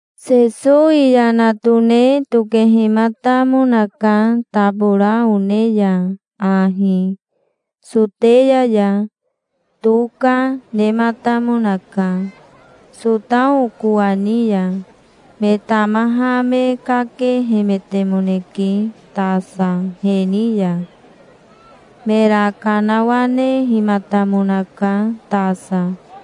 Sesowi yana tone tokehimatamonaka tabora one ya ahi, Soteya ya. Toka, nematamonaka, Sotao kowani ya. Me tamaha me kakehemetemoneke tasa he ni ya. Mera kanawanehimatamonaka tasa.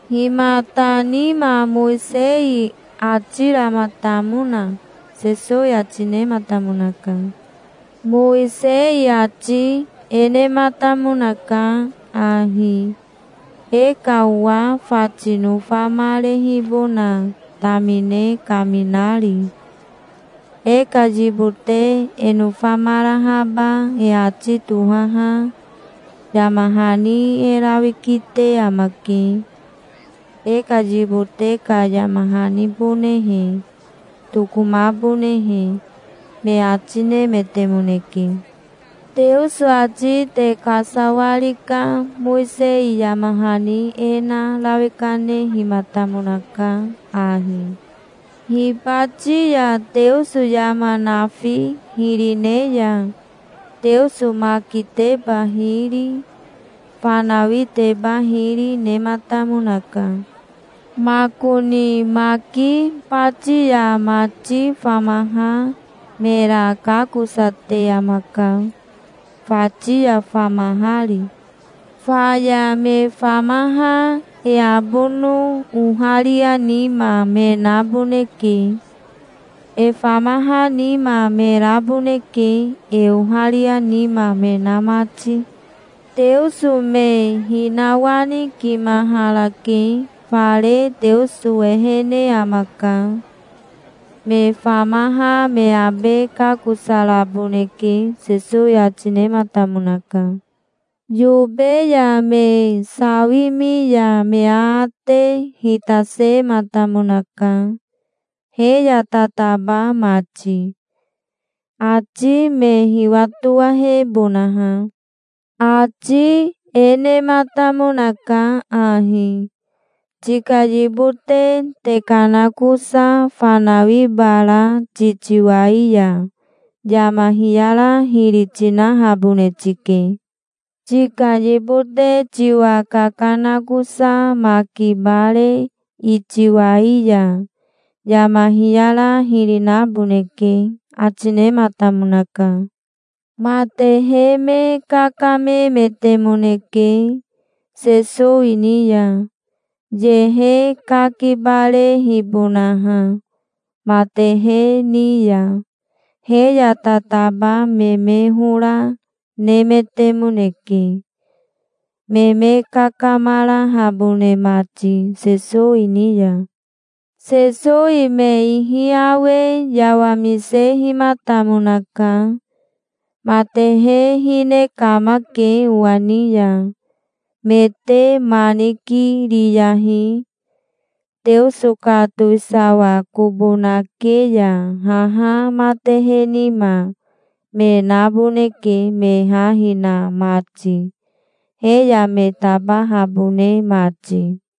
"Himata nima Mowisei ati ramatamona?" Sesowi ati nematamonaka. "Mowisei ati e nematamonaka ahi, e ka owa fati nofamarehibona tamine kaminari: E ka yibote e nofamarahaba e ati tohaha yama hani e rawi kite amake, e ka yibote ka yama hanibonehe, tokomabonehe", me ati nemetemoneke. "Teoso ati te kasawari ka Mowisei yama hani e na rawi kanehimatamonaka ahi. Hibati ya Teoso yama nafi hiri ne ya Teoso makiteba hiri, fanawiteba hiri, nematamonaka. Makoni maki bati ya mati famaha mera kakosate amaka, fati ya famahari. Faya me famaha e abono oharia nima me naboneke. E famaha nima me raboneke, e oharia nima me na mati. Teoso me hinawanikimaharake. Fare Teoso ehene amaka. Me famaha me abe kakosaraboneke", Sesowi ati nematamonaka. Yobe ya me sawimi ya me aate hitasematamonaka, he ya tataba mati, ati me hiwatowahebonaha. Ati e nematamonaka ahi: "Tika yibote tekanakosa fanawi bara titiwai ya yama hiyara hiri tinahabone tike. Tika yibote tiwa kakanakosa maki bare itiwai ya yama hiyara hiri naboneke", ati nematamonaka. Matehe me kakamemetemoneke Sesowi ni ya, yehe kakibarehibonaha, matehe ni ya. He ya tataba me me hora nemetemoneke, me me kakamarahabone mati Sesowi ni ya. Sesowi me ihi awe yawamisehimatamonaka. "Matehe hine kamake owa ni ya. Me te ma nikiriyahi. Teoso ka towisawa kobo nake ya haha matehe nima me naboneke me ha hina mati, he ya me tabahabone mati.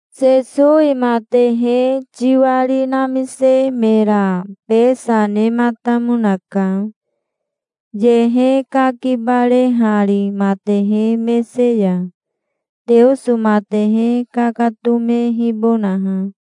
Sesowi matehe tiwari namise mera besa nematamonaka, yehe kakibarehari matehe mese ya, Teoso matehe kakatomehibonaha.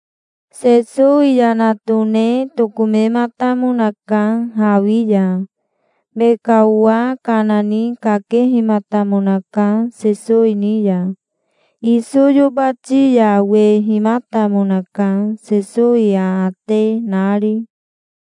Sesowi yana tone tokomematamonaka hawi ya. Me ka owa kana ni kakehimatamonaka Sesowi ni ya. Iso yobati ya wehimatamonaka, Sesowi aate nari.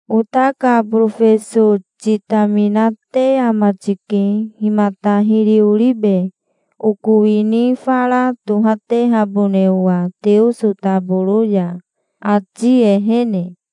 "Ota ka borofeso titaminate ama tike. Himata hiri oribe, oko wini fara tohatehabone owa Teoso taboro ya, ati ehene?"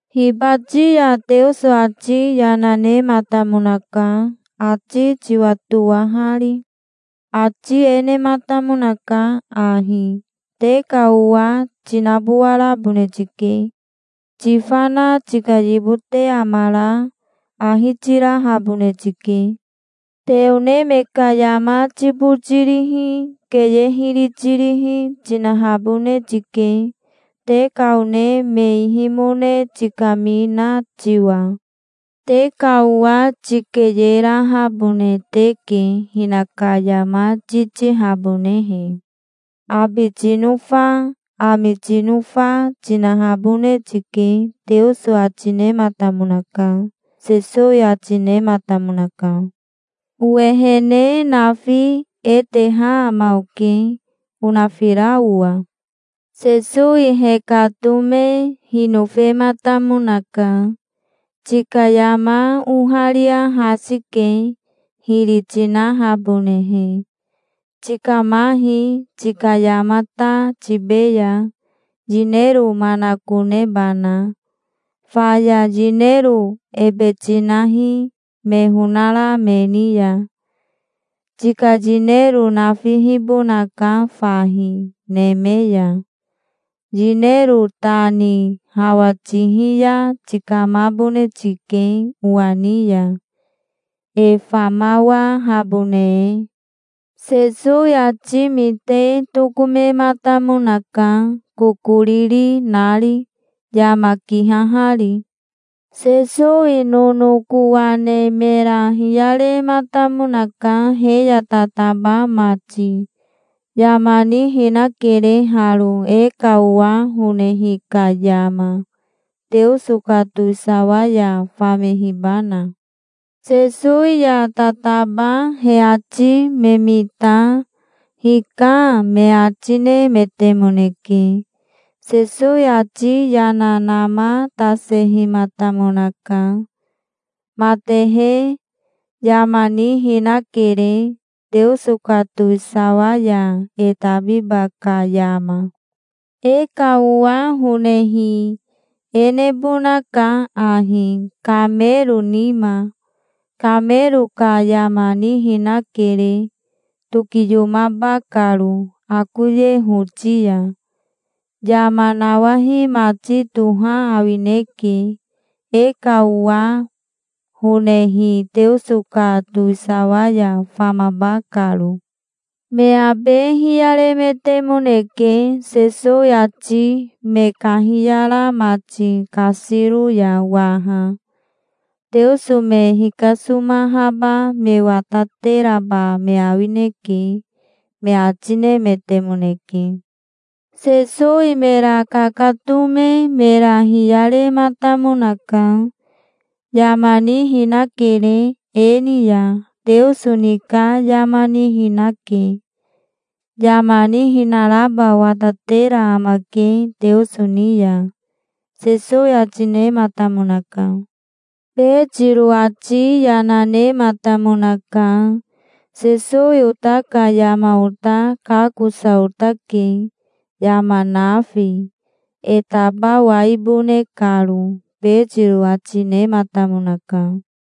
Hibati ya Teoso ati yana nematamonaka, ati tiwatowahari. Ati e nematamonaka ahi: 'Te ka owa tinabowarabone tike. Tifana tika yibote amara ahi tirahabone tike. Te one me ka yama tibotirihi, keye hiri tirihi, tinahabone tike, te ka one me ihimone tikamina tiwa. Te ka owa tikeyerahabone teke, hinaka yama titihabonehe. Abi tinofa, ami tinofa, tinahabone tike', Teoso ati nematamonaka", Sesowi ati nematamonaka. "Owehene nafi e teha ama oke, onafira owa". Sesowi hekatome hinofematamonaka. "Tika yama oharia hasi ke, hiri tinahabonehe. Tikamahi, tika yama ta tibeya, yinero manakonebana. Faya yinero ebe tinahi, me honara me ni ya. Tika yinero nafihibonaka fahi, neme ya. Yinero ta ni hawa tihi ya tikamabone tike owa ni ya, e famawahabone e". Sesowi ati mite tokomematamonaka, kokoriri nari, yama kihahari. Sesowi nonokowa ne mera hiyarematamonaka, he ya tataba mati. "Yama nihinakere haro, e ka owa honehi ka yama, Teoso ka towisawa ya famehibana". Sesowi ya tataba he ati me mita "Hika", me ati nemetemoneke. Sesowi ati yana namatasehimatamonaka. "Matehe, yama nihinakere, Teoso ka towisawa ya e tabiba ka yama. E ka owa honehi e nebonaka ahi, kamero nima. Kamero ka yama nihinakere, tokiyomaba karo akoye hoti ya. Yama nawahi mati toha awineke, e ka owa honehi Teoso ka towisawa ya famaba karo". Me abe hiyaremetemoneke, Sesowi ati me kahiyara mati kasiro ya waha. "Teoso me hikasomahaba me watateraba me awineke", me ati nemetemoneke. Sesowi mera kakatome mera hiyarematamonaka. "Yama nihinakere e ni ya. Teoso ni ka yama nihinake. Yama nihinaraba watatera amake Teoso ni ya", Sesowi ati nematamonaka. Betiro ati yana nematamonaka. "Sesowi ota ka yama ota kakosa otake, yama nafi, e tabawaibone karo", Betiro ati nematamonaka.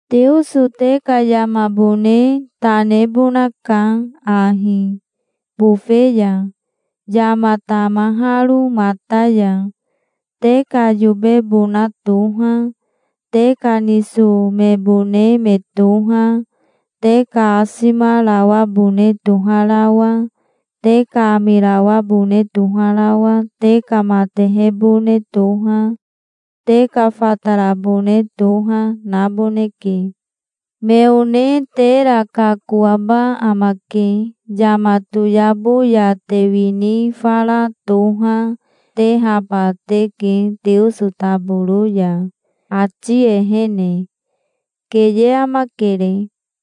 Teoso te ka yamabone ta nebonaka ahi, bofe ya, yama tamaharo mata ya. Te ka yobebona toha, te ka niso mebone me toha, te ka asimarawabone toharawa, te ka amirawabone toharawa, te ka matehebone toha, te ka fatarabone toha, naboneke. Me one tera kakoaba amake. Yama toyabo ya te wini fara toha, tehaba teke Teoso taboro ya, ati ehene. Keye amakere.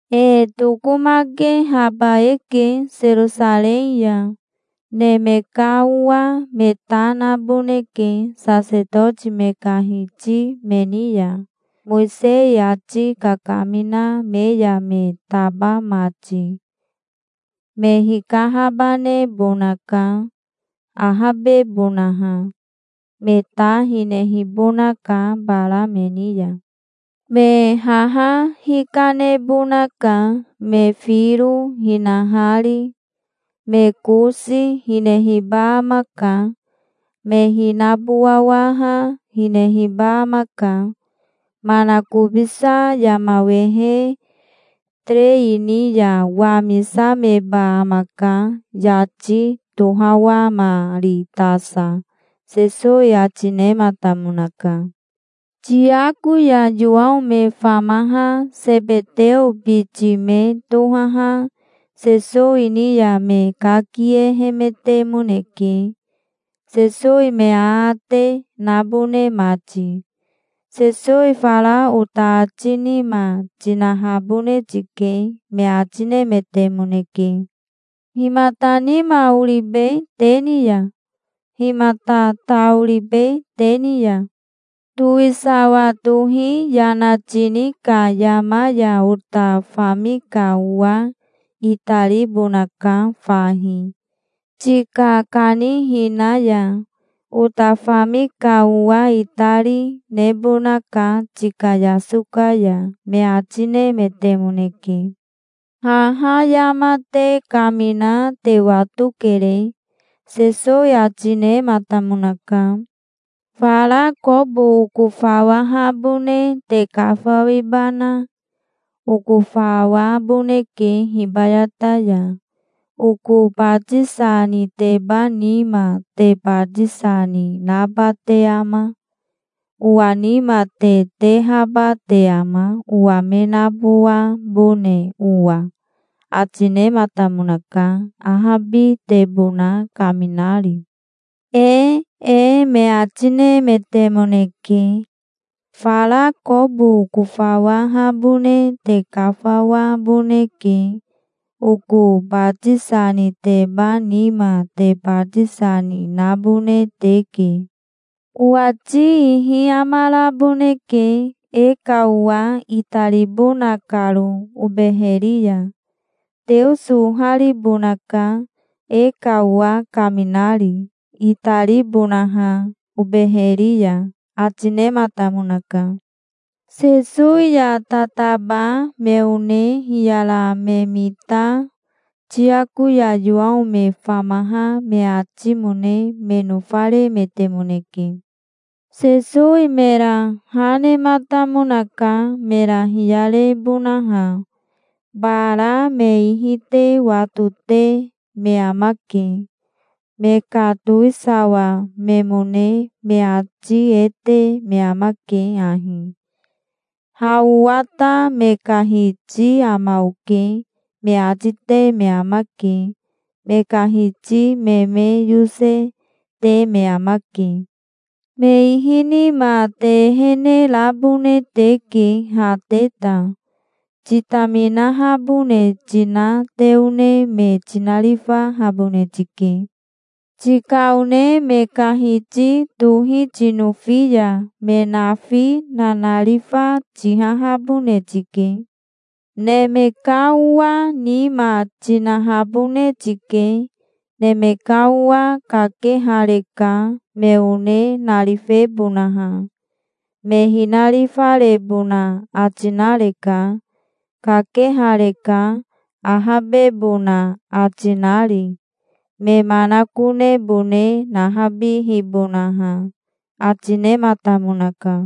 "E tokomakehaba eke Serosarei ya. Neme ka Owa me ta naboneke sasetoti me ka hiti me ni ya, Mowisei ati kakamina me ya me taba mati. Me hikahabanebonaka, ahabebonaha. Me ta hinehibonaka bara me ni ya. Me haha hikanebonaka, me firo hinahari. Me kosi hinehiba amaka. Me hinabowawaha hinehiba amaka. Manakobisa yama wehe terei ni ya wamisameba amaka yati tohawamari tasa", Sesowi ati nematamonaka. Tiako ya Yowao me famaha Sebeteo biti me tohaha Sesowi ni ya me kakiehemetemoneke, Sesowi me aate nabone mati. "Sesowi fara ota ati nima tinahabone tike", me ati nemetemoneke. "Himata nima oribe te ni ya? Himata ta oribe te ni ya?" "Towisawa tohi yana tini ka yama ya ota fami ka owa itaribonaka fahi, tika kanihina ya. Ota fami ka owa itari, nebonaka tika yasoka ya", me ati nemetemoneke. "Haha yama te kamina te watokere", Sesowi ati nematamonaka. "Fara kobo okofawahabone te kafawibana? Okofawaboneke hibayata ya. Oko batisa niteba nima te batisa ni naba te ama? Owa nima te tehaba te ama, owa me nabowabone owa?" ati nematamonaka, ahabitebona kaminari. "Ee", me ati nemetemoneke. "Fara kobo okofawahabone te kafawaboneke. Oko batisa niteba nima te batisa ni nabone teke. Owati ihi amaraboneke, e ka owa itaribona karo obeheri ya. Teoso oharibonaka, e ka owa kaminari, itaribonaha obeheri ya", ati nematamonaka. Sesowi ya tataba me one hiyara me mita Tiako ya Yowao me famaha me atimone me nofaremetemoneke. Sesowi mera ha nematamonaka, mera hiyarebonaha. "Bara me ihi te watote me amake. Me ka towisawa memone me ati e te me amake ahi: 'Ha owa ta me ka hiti ama oke', me ati te me amake. Me ka hiti me me yose, te me amake. Me ihi nima te ehene rabone teke ha te ta. Titaminahabone tina te one me tinarifahabone tike. Tika one me ka hiti tohi tinofi ya me nafi nanarifa tihahabone tike. Neme ka Owa nima tinahabone tike. Neme ka Owa kakehareka, me one narifebonaha. Me hinarifarebona ati nareka. Kakehareka, ahabebona ati nari, me manakonebone nahabihibonaha", ati nematamonaka.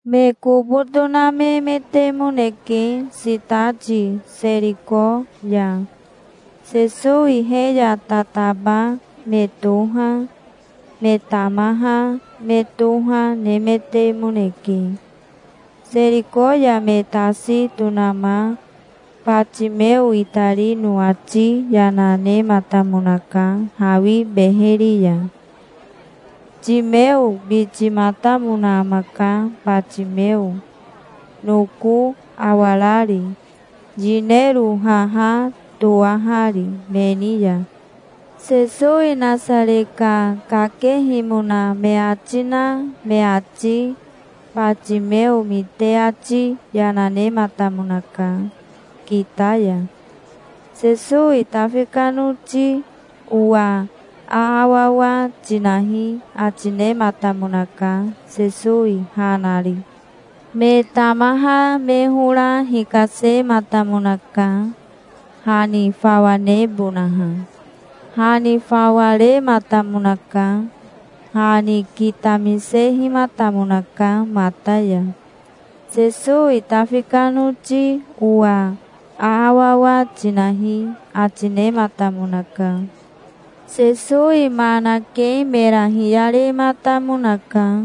Me kobo tonamemetemoneke sitati Seriko ya. Sesowi he ya tataba me toha, me tamaha me toha, nemetemoneke. Seriko ya me tasi tonama Batimeo itarino ati yana nematamonaka hawi beheri ya. Timeo bitimatamona amaka Batimeo, noko awarari, yinero haha toahari me ni ya. Sesowi Nasare ka kakehimona me ati na me ati Batimeo mite ati yana nematamonaka, kita ya. "Sesowi Tafi ka noti owa aawawa tinahi", ati nematamonaka, Sesowi ha nari. Me tamaha me hora hikasematamonaka, ha ni fawa nebonaha. Ha ni fawa rematamonaka. Ha ni kitamisehimatamonaka mata ya. "Sesowi Tafi ka noti owa aawawa tinahi", ati nematamonaka. Sesowi ma nake mera hiyarematamonaka.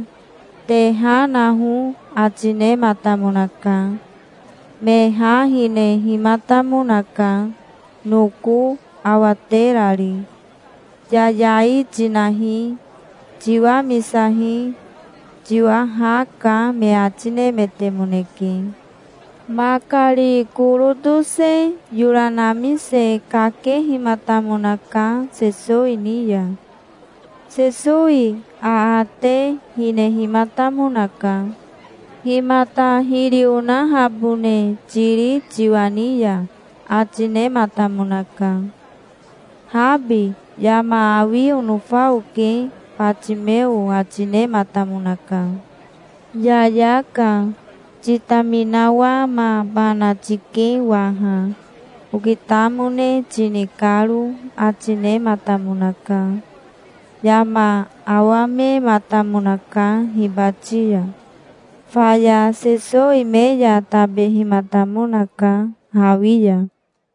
"Te ha naho", ati nematamonaka. Me ha hinehimatamonaka, noko awaterari. "Yayai tinahi. Tiwamisahi. Tiwa ha ka", me ati nemetemoneke. Makari koro tose yora namise kakehimatamonaka Sesowi ni ya. Sesowi aate hinehimatamonaka. "Himata hiri onahabone tiri tiwa ni ya?" ati nematamonaka. "Habi, yama awi onofa oke", Batimeo ati nematamonaka. "Yayaka. Titaminawamabana tike waha, okitamone tini karo", ati nematamonaka. Yama awamematamonaka hibati ya. Faya Sesowi me ya tabehimatamonaka, hawi ya.